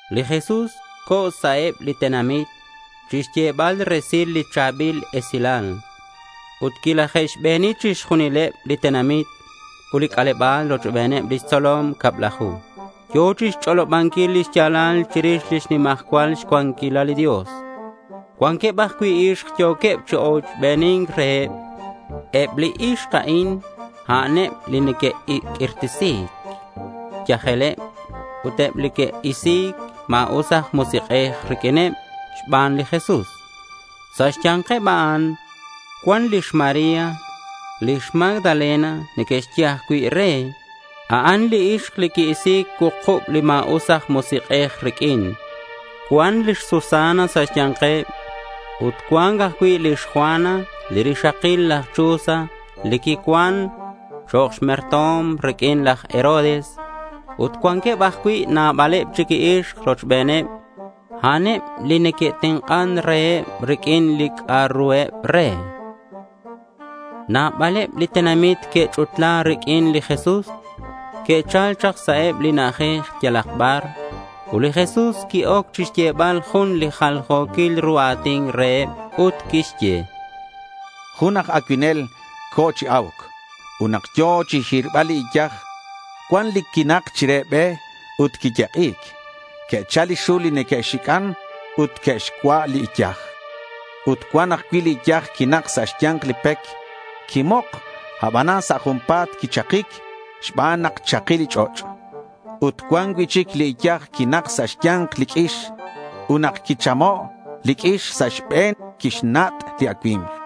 Li Jesús co̱ sa' eb li tenamit chixyebal resil li cha̱bil esilal. Ut quilaje'xbeni chixjunileb li tenamit ut li c'aleba̱l rochbeneb lix tzolom cablaju. Yo̱ chixch'olobanquil lix ya̱lal chirix lix nimajcual cuanquilal li Dios. Cuanqueb ajcui' ixk yo̱queb chi ochbeni̱nc reheb. Eb li ixk a'in, a'an eb li que'q'uirtesi̱c xyajeleb ut eb li que'isi̱c ma̱us aj musik'ej riq'uineb xban li Jesús. Sa' xya̱nkeb a'an cuan lix María. Lix Magdalena neque'xye ajcui' re. A'an li ixk li qui-isi̱c cuukub li ma̱us aj musik'ej riq'uin. Cuan lix Susana sa' xya̱nkeb. Ut cuan ajcui' lix Juana li rixakil laj Chuza li quicuan chok' merto̱m riq'uin laj Herodes. Ut cuanqueb ajcui' nabaleb chic li ixk rochbeneb. A'an eb li neque'tenk'an reheb riq'uin li c'a'ruheb re. Nabaleb li tenamit que'ch'utla riq'uin li Jesús. Que'chal chak sa' eb li na'ajej yalak bar. Ut li Jesús qui-oc chixyebal jun li jaljo̱quil ru a̱tin reheb. Ut quixye: —Jun aj acuinel co̱ chi a̱uc. Ut nak yo̱ chixhirbal li iyaj, cuan li quinak chire be ut quiyek'i̱c. Que'chal li xul li neque'xic'an ut que'xcua' li iyaj. Ut cuan ajcui' li iyaj quinak sa' xya̱nk li pec. Quimok, abanan sa' junpa̱t quichakic xban nak chaki li ch'och'. Ut cuan cui'chic li iyaj quinak sa' xya̱nk li q'uix. Ut nak quichamo' li q'uix sa' xbe̱n, quixnat' li acui̱mk.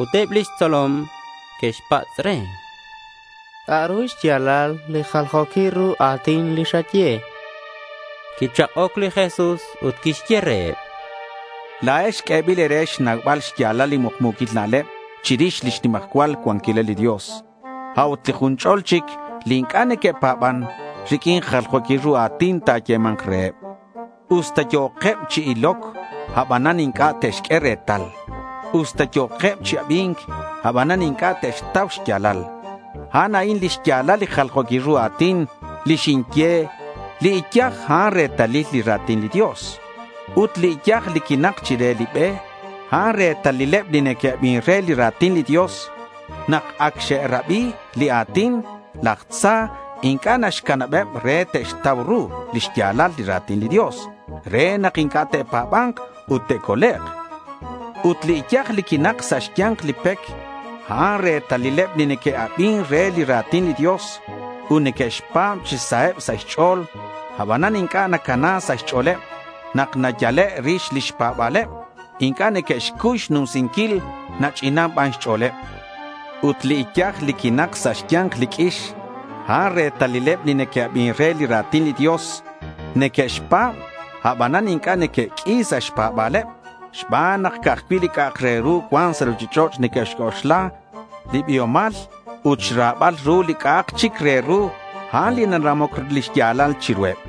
Ut eb lix tzolom que'xpatz' re: —¿C'a'ru xya̱lal li jaljo̱quil ru a̱tin li xaye? chanqueb. Quichak'oc li Jesús ut quixye reheb: —La̱ex q'uebil e̱re xnaubal xya̱lal li mukmu̱quil na'leb chirix lix nimajcual cuanquilal li Dios. A'ut li jun ch'ol chic li inc'a' neque'pa̱ban, riq'uin jaljo̱quil ru a̱tin ta̱yema̱nk reheb. Usta yo̱queb chi iloc, abanan inc'a' te'xq'ue retal. Usta yo̱queb chi abi̱nc, abanan inc'a' te'xtau xya̱lal. A'an a'in lix ya̱lal li jaljo̱quil ru a̱tin li xinye. Li iyaj, a'an retalil li ra̱tin li Dios. Ut li iyaj li quinak chire li be, a'an retalileb li neque'abin re li ra̱tin li Dios. Nak ac xe'rabi li a̱tin, laj tza inc'a' naxcanabeb re te'xtau ru li xya̱lal li ra̱tin li Dios re nak inc'a' te'pa̱ba̱nk ut te'colek'. Ut li iyaj li quinak sa' xya̱nk li pec, a'an retalileb li neque'abin re li ra̱tin li Dios ut neque'xpa̱b chi saheb sa' xch'o̱l. Abanan inc'a' nacana sa' xch'o̱leb. Nak nayale' rix lix pa̱ba̱leb, inc'a' neque'xcuy xnumsinquil. Nach'inan ban xch'o̱leb. Ut li iyaj li quinak sa' xya̱nk li q'uix, a'an retalileb li neque'abin re li ra̱tin li Dios. Neque'xpa̱b, abanan inc'a' neque'q'ui sa' xpa̱ba̱leb xban nak ca'aj cui' li c'a'ak re ru cuan sa' ruchich'och' neque'xc'oxla, li biomal ut xra̱bal ru li c'a'ak chic re ru. A'an li naramoc lix ya̱lal chiruheb.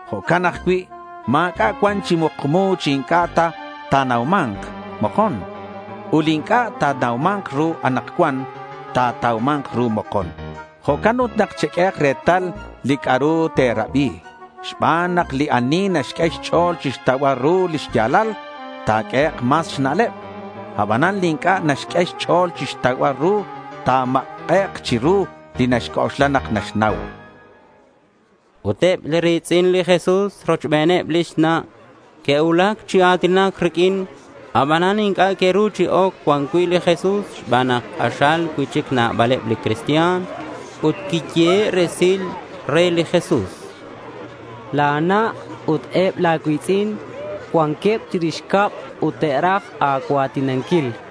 Jo'can ajcui' ma̱c'a' cuan chi mukmu chi inc'a' ta ta̱nauma̱nk mokon. Ut li inc'a' natauman ru anakcuan, ta̱tauma̱nk ru mokon. Jo'can ut cheq'uehak retal li c'a'ru te̱rabi xban nak li ani naxq'ue xch'o̱l chixtaubal ru li xya̱lal, ta̱q'uehek' mas xna'leb. Abanan li inc'a' naxq'ue xch'o̱l chixtaubal ru, ta̱mak'ek' chiru li naxc'oxla nak naxnau, chan. Ut eb li ri̱tz'in li Jesús rochbeneb lix na' que'cuulac chi a̱tinac riq'uin. Abanan inc'a' que'ru chi oc cuan cui' li Jesús xban nak k'axal cui'chic nabaleb li cristian. Ut quiyehe' resil re li Jesús: —La̱ na' ut eb la̱ cui̱tz'in cuanqueb chirix cab ut te'raj a̱cua̱tinanquil, chan.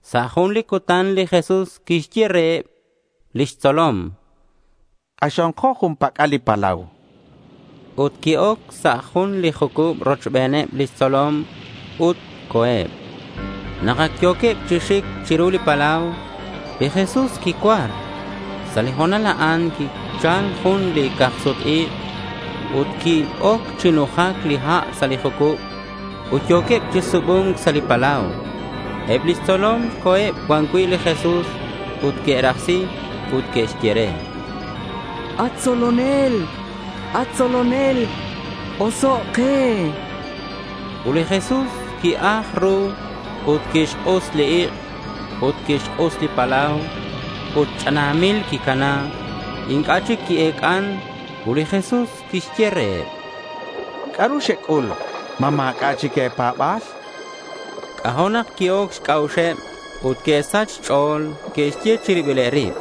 Sa' jun li cutan li Jesús quixye reheb lix tzolom: —K'axonko jun pac'al li palau, chan reheb. Ut qui-oc sa' jun li jucub rochbeneb lix tzolom ut co̱eb. Nak ac yo̱queb chi xic chiru li palau, li Jesús quicuar. Sa' li ho̱nal a'an quichal jun li ca̱k-sut-ik' ut qui-oc chi nujac li ha' sa' li jucub ut yo̱queb re chi subu̱nc sa' li palau. Eb lix tzolom co̱eb cuan cui' li Jesús ut que'rajsi. Ut que'xye re: —At tzolonel, at tzolonel, osoc' ke, chanqueb. Ut li Jesús qui-aj ru ut quixk'us li ik' ut quixk'us li palau ut ch'anamil quicana. Inc'a' chic qui-ec'an. Ut li Jesús quixye reheb: —¿C'a'ru xec'ul? ¿Ma ma̱c'a' chic e̱pa̱ba̱l? chan. C'ajo' nak qui-oc xc'a'uxeb ut que'xsach xch'o̱l. Que'xye chi ribileb rib,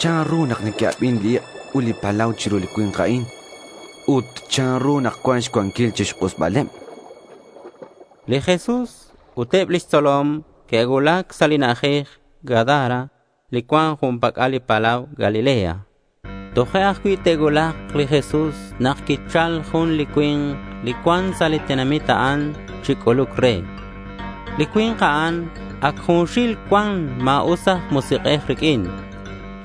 —¿Chanru nak neque'abin li ik' ut li palau chiru li cui̱nk a'in? Ut, ¿chanru nak cuan xcuanquil chixk'usbaleb? chanqueb. Li Jesús ut eb lix tzolom que'cuulac sa' li na'ajej Gadara li cuan jun pac'al li palau Galilea. Toje' ajcui' te'cuulak li Jesús nak quichal jun li cui̱nk li cuan sa' li tenamit a'an chi c'uluc re. Li cui̱nk a'an ac junxil cuan ma̱us aj musik'ej riq'uin.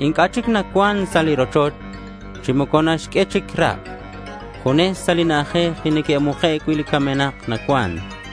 Inc'a' chic nacuan sa' rochoch chi moco naxq'ue chic rak'. Junes sa' li na'ajej li neque'muke' cui' li camenak nacuan.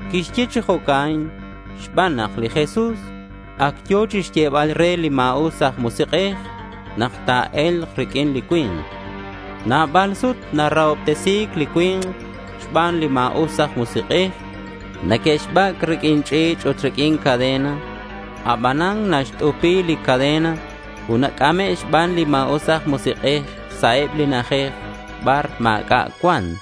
Quixye chi jo'can xban nak li Jesús ac yo̱ chixyebal re li ma̱us aj musik'ej nak ta̱e̱lk riq'uin li cui̱nk. Nabal sut narahobtesi̱c li cui̱nk xban li ma̱us aj musik'ej. Neque'xbac' riq'uin ch'i̱ch' ut riq'uin cadena. Abanan naxt'upi li cadena ut nac'ame' xban li ma̱us aj musik'ej sa' eb li na'ajej bar ma̱c'a' cuan.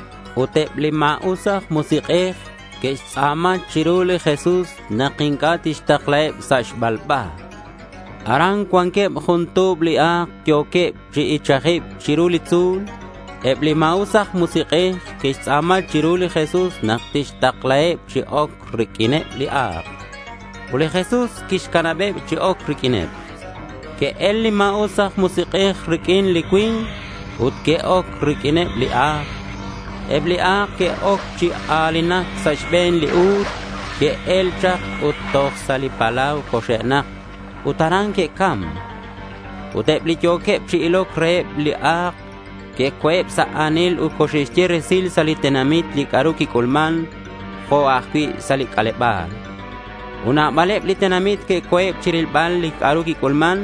Ut eb li ma̱us aj musik'ej que'xtz'a̱ma chiru li Jesús nak inc'a' tixtaklaheb sa' xbalba. Aran cuanqueb jun tu̱b li a̱k yo̱queb chi ichajibc chiru li tzu̱l. Eb li ma̱us aj musik'ej que'xtz'a̱ma chiru li Jesús nak tixtaklaheb chi oc riq'uineb li a̱k. Ut li Jesús quixcanabeb chi oc riq'uineb. Que'el li ma̱us aj musik'ej riq'uin li cui̱nk ut que'oc riq'uineb li a̱k. Eb li a̱k que'oc chi a̱linac. Sa' xbe̱n li u̱l que'el chak ut toj sa' li palau coxe'nak ut aran que'cam. Ut eb li yo̱queb chi iloc reheb li a̱k que'co̱eb sa' a̱nil ut coxe'xye resil sa' li tenamit li c'a'ru quic'ulman jo' ajcui' sa' li c'aleba̱l. Ut nabaleb li tenamit que'co̱eb chirilbal li c'a'ru quic'ulman.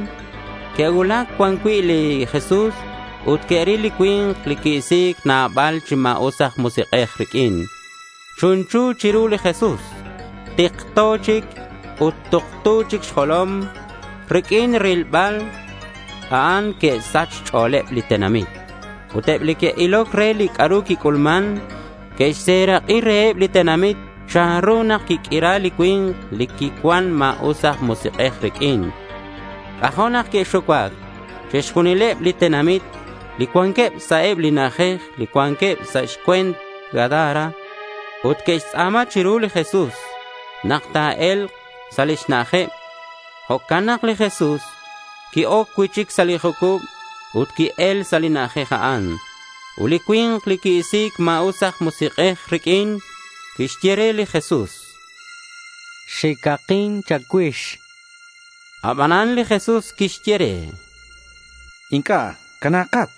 Que'cuulac cuan cui' li Jesús ut que'ril li cui̱nk li qui-isi̱c nabal chi ma̱us aj musik'ej riq'uin. Chunchu chiru li Jesús. Tikto chic ut tuktu chic xjolom. Riq'uin rilbal a'an que'sach xch'o̱leb li tenamit. Ut eb li que'iloc re li c'a'ru quic'ulman, que'xserak'i reheb li tenamit chanru nak quiq'uira li cui̱nk li quicuan ma̱us aj musik'ej riq'uin. C'ajo' nak que'xucuac chixjunileb li tenamit li cuanqueb sa' eb li na'ajej li cuanqueb sa' xcue̱nt Gadara. Ut que'xtz'a̱ma chiru li Jesús nak ta̱e̱lk sa' lix na'ajeb. Jo'can nak li Jesús qui-oc cui'chic sa' li jucub ut qui-el sa' li na'ajej a'an. Ut li cui̱nk li qui-isi̱c ma̱us aj musik'ej riq'uin quixye re li Jesús: —Xicakin cha̱cuix, chan re. Abanan li Jesús quixye re: —Inc'a'. Cana̱kat.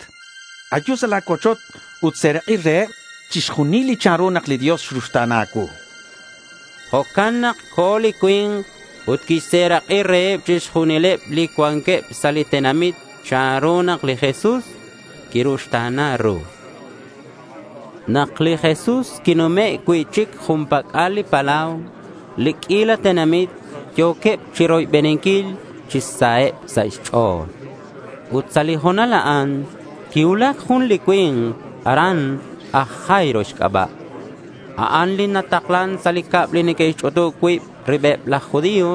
Ayu sa' la̱ cuochoch ut ta̱serak'i reheb chixjunileb chanru nak li Dios xruxta̱na a̱cuu, chan li Jesús. Jo'can nak co̱ li cui̱nk ut quixserak'i reheb chixjunileb li cuanqueb sa' li tenamit chanru nak li Jesús quiruxta̱na ru. Nak li Jesús quinume' cui'chic jun pac'al li palau, li q'uila tenamit yo̱queb chiroybeninquil chi saheb sa' xch'o̱l. Ut sa' li ho̱nal a'an quicuulac jun li cui̱nk aran aj Jairo xc'aba'. A'an li nataklan sa' li cab li neque'xch'utub cui' ribeb laj judío.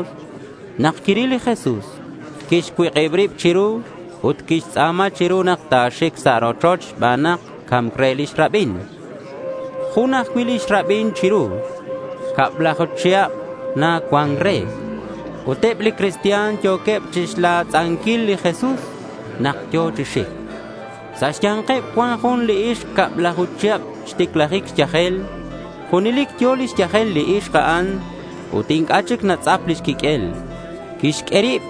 Nak quiril li Jesús, quixcuik'ib rib chiru ut quixtz'a̱ma chiru nak ta̱xic sa' rochoch xban nak ca̱mc re lix rabin. Jun ajcui' lix rabin chiru. Cablaju chihab na cuan re. Ut eb li cristian yo̱queb chixlatz'anquil li Jesús nak yo̱ chi xic. Sa' xya̱nkeb cuan jun li ixk cablaju chihab xticlajic xyajel. Junelic yo̱ lix yajel li ixk a'an ut inc'a' chic natz'ap lix quiq'uel. Quixq'ue rib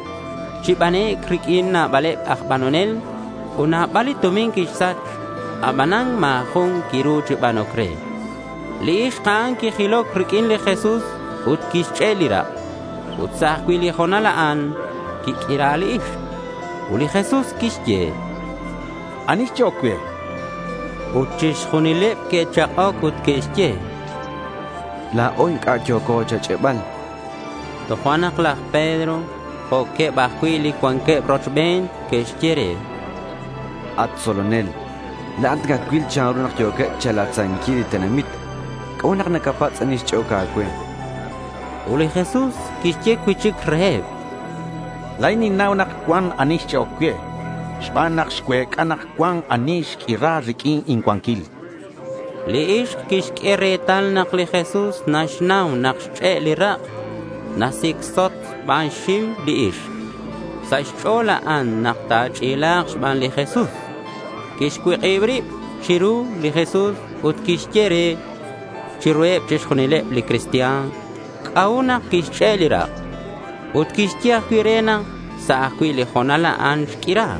chi banec' riq'uin nabaleb aj banonel ut nabal li tumin quixsach. Abanan ma̱ jun quiru chi banoc re. Li ixk a'an quijiloc riq'uin li Jesús ut quixch'e' li rak'. Ut sa' ajcui' li ho̱nal a'an quiq'uira li ixk. Ut li Jesús quixye: —¿Ani xch'e'oc cue?— Ut chixjunileb que'chak'oc ut que'xye: —La̱o inc'a' yo̱co cha̱ch'e'bal.— Tojo'nak laj Pedro jo'queb ajcui' li cuanqueb rochben que'xye re: —At tzolonel, la̱at nacacuil chanru nak yo̱queb cha̱latz'anquil li tenamit. ¿C'a'ut nak nacapatz' ani xch'e'oc a̱cue? chanqueb re. Ut li Jesús quixye cui'chic reheb: —La̱in ninnau nak cuan ani xch'e'oc cue xban nak xcuec'a nak cuan ani xq'uira riq'uin incuanquil, chan. Li ixk quixq'ue retal nak li Jesús naxnau nak xch'e' li rak'. Nasicsot xban xxiu li ixk. Sa' xch'o̱l a'an nak ta̱ch'ila̱k xban li Jesús. Quixcuik'ib rib chiru li Jesús ut quixye re chiruheb chixjunileb li cristian c'a'ut nak quixch'e' li rak'. Ut quixye ajcui' re nak sa' ajcui' li ho̱nal a'an xq'uira.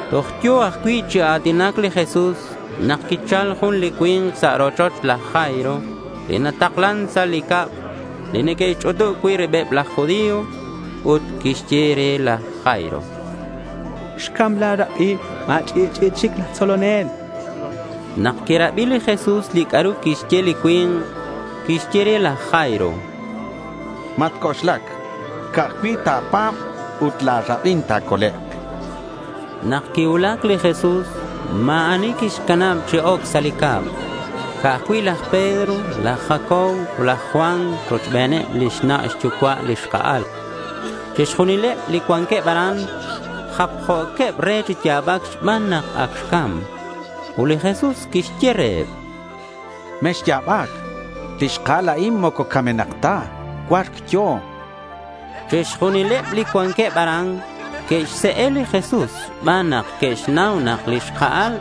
Toj yo̱ ajcui' chi a̱tinac li Jesús nak quichal jun li cui̱nk sa' rochoch laj Jairo li nataklan sa' li cab li neque'xch'utub cui' ribeb laj judío ut quixye re laj Jairo: —Xcam la̱ rabin. Ma̱ch'i'ch'i'i chic laj tzolonel, chan re. Nak quirabi li Jesús li c'a'ru quixye li cui̱nk, quixye re laj Jairo: —Matc'oxlac. Ca'aj cui' ta̱pa̱b ut la̱ rabin ta̱colek', chan. Nak quicuulac li Jesús, ma̱ ani quixcanab chi oc sa' li cab. Ca'aj cui' laj Pedro, laj Jacobo ut laj Juan rochbeneb lix na' xyucua' li xka'al. Chixjunileb li cuanqueb aran japjo̱queb re chi ya̱bac xban nak ac xcam. Ut li Jesús quixye reheb: —Mexya̱bac. Li xka'al a'in moco camenak ta. Cua̱rc yo̱, chan. Chixjunileb li cuanqueb aran que'xse'e li Jesús xban nak que'xnau nak li xka'al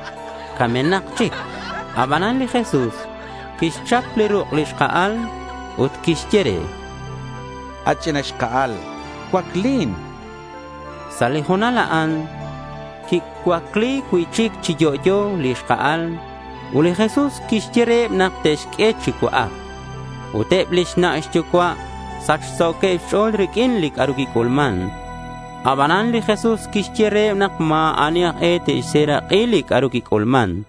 camenak chic. Abanan li Jesús quixchap chi ruk' li xka'al, ut quixye re: —At ch'ina xka'al, cuaclin, chan. Sa' li ho̱nal a'an quicuacli cui'chic chi yo'yo li xka'al. Ut li Jesús quixye reheb nak te'xq'ue chi cua'ac. Ut eb lix na' xyucua' sachso̱queb xch'o̱l riq'uin li quic'ulman. Abanan li Jesús quixye reheb nak ma̱ ani aj e te'xserak'i li c'a'ru quic'ulman.